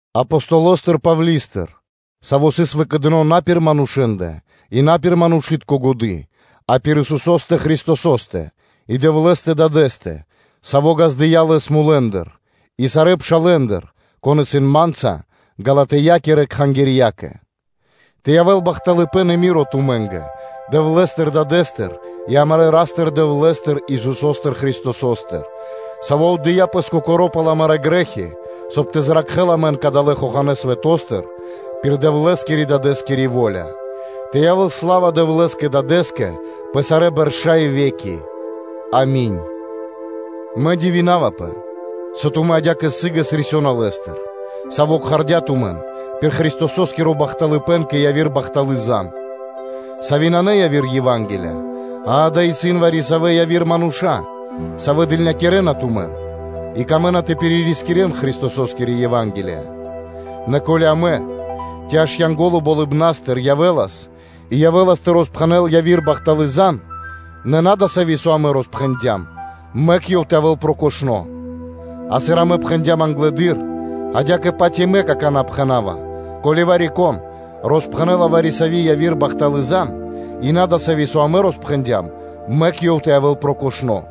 Апостолостыр Павли́стыр, саво́ сыс выкэдыно на пир манушэ́ндэ и на пир манушы́тко годы́, а пир Исусо́стэ Христосо́стэ и Дэвлэ́стэ Дадэ́стэ, Саво́ ґаздыя́ Лэс мулэ́ндыр, и сарэ́ пшалэ́ндыр, кон исын ма́нца, Галатиякирэ кхангирьякэ. Тэ явэ́л бахталыпэ́н и рама́нё (миро) тумэ́нгэ Дэвлэ́стыр Дадэ́стыр и амарэ́ Ра́стыр-Дэвлэ́стыр, Исусо́стыр Христосостыр, Саво́ отдыя́ Пэс Кокоро́ пал амарэ́ грэ́хи, соб (кай) тэ зракхэ́л амэн далэ́ хоханэ́ свэто́стыр пир Дэвлэ́скирэ-Дадэ́скири во́ля, тэ явэ́л сла́ва Дэвлэ́скэ Дадэ́скэ пэ сарэ́ бэрша́ и ве́ки. Ами́нь. Мэ дивинавапэ, со тумэ́ адя́кэ сы́гэс рисёна Лэ́стыр, Саво́ кхардя́ тумэн пир Христосо́скиро бахталыпэ́н кэ яви́р бахталы́ зан (звесь), сави́ нанэ яви́р Ева́нгелия, а дава́ исын вари-савэ́ яви́р мануша́, савэ́ дылнякирэна тумэн и камэ́на тэ пиририскирэн Христососкири Ева́нгелия. Нэ ко́ли амэ, ци аж Янго́ло Болыбна́стыр явэ́лас и явэ́лас тэ роспхэнэл яви́р бахталы́ зан (звесь), нэ на дасави́, со амэ роспхэндям; мэк ёв тэ явэ́л прокошно́. А сыр амэ пхэндям англэды́р, адя́кэ-паць и мэ какана́ пхэна́ва: ко́ли вари-кон роспхэнэ́ла вари-сави́ яви́р бахталы́ зан (звесь), и на дасави́, со амэ роспхэндям, мэк ёв тэ явэ́л прокошно́.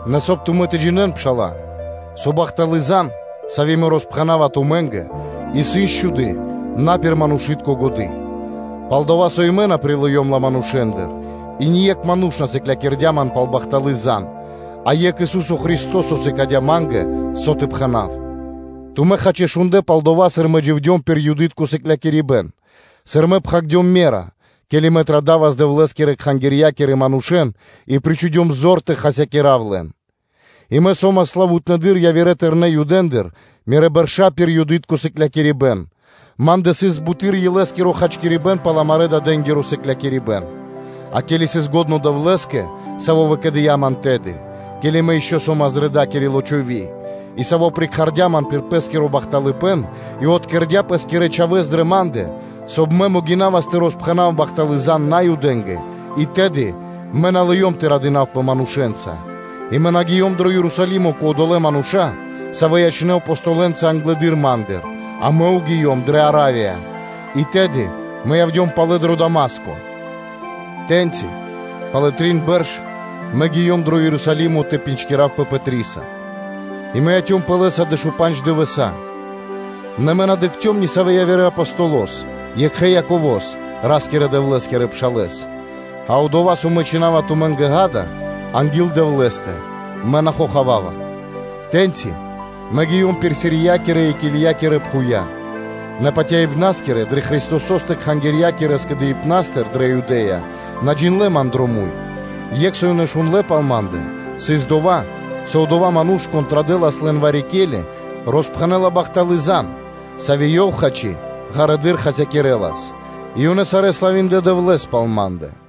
Нэ соб (кай) тумэ́ тэ джинэ́н, пшала́лэ, со бахталы́ зан (звесь), сави́ мэ роспхэнава тумэ́нгэ, исын счхуды на пир манушы́тко годы́. Пал-дова́ со и мэ на прилыём ла манушэ́ндыр, и ние́кх ману́ш на сыклякирдя́ ман пал бахталы́ зан (звесь), а Екх Ису́со Христо́со сыкадя́ ма́нгэ, со тэ пхэна́в. Тумэ́, хачи, шундлэ́ пал дова́, сыр мэ дживдём пир Юды́тко сыклякирибэ́н, сыр мэ пхагирдём ме́ра, ке́ли мэ традавас Дэвлэ́скирэ кхангирья́кирэ манушэ́н и причхудём зор тэ хасякира́в лэн; и мэ со́мас славутнэдыр явирэ тэрнэ́ Юдэндыр мирэ́ бэршэса пир Юды́тко сыклякирибэ́н, ма́ндэ сыс буты́р илэ́скиро хачкирибэ́н пал амарэ́-дадэ́нгиро присыкляибэн. А ке́ли сыс лачхо́ Дэвлэ́скэ, Саво́ выкэдыя́ ман тэды, ке́ли мэ ишчо (инкэ́) со́мас дрэ дакири лочови́ (утроба); и Саво́ прикхардя ман пир Пэ́скиро бахталыпэ́н, и откэрдя Пэ́скирэ Чхавэ́с дрэ ма́ндэ, соб (кай) мэ могинавас тэ роспхэнав бахталы́ зан Наюдэ́нгэ, и тэды мэ на лыём тэ радинавпэ манушэ́нца, и мэ на гиём дро Ерусалимо кэ одолэ́ мануша́, савэ́ ячнэ́ Апо́столы (Апостолэнца) англэды́р ма́ндыр, а мэ гиём дрэ Аравия, и тэды явдём палэ дро Дама́ско. Тэ́ньци, пало́ (после) трин бэрш мэ гиём дро Ерусалимо тэ дыкхавпэ Пэтриса, и мэ яцёмпэ лэ́са дэшупандж дывэса́; нэ мэ на дыкхцём ни савэ́ явирэ Апостолос, екхэ Яково́с, Ра́скирэ-Дэвлэ́скирэ пшалэ́с. А дова́, со мэ чхина́ва тумэ́нгэ, ґа́да, – анги́л Дэвлэ́стэ, мэ на хохавава. Тэ́ньци мэ гиём пир Сириякирэ и Килиякирэ пхувья́. Нэ патяибнаскирэ дрэ Христосо́стэ кхангирья́кирэ скэдыибна́стыр дрэ Юдэ́я на джиндлэ́ ман дро муй; екх, со ёнэ шундлэ́ пал ма́ндэ, сыс дова́, со одова́ ману́ш, кон традэлас лэн вари-ке́ли, роспхэнэ́ла бахталы́ зан (звесь), сави́ ёв, хачи, ґарэдыр хасякирэлас: и ёнэ сарэ́ славиндлэ Дэвлэ́с пал ма́ндэ.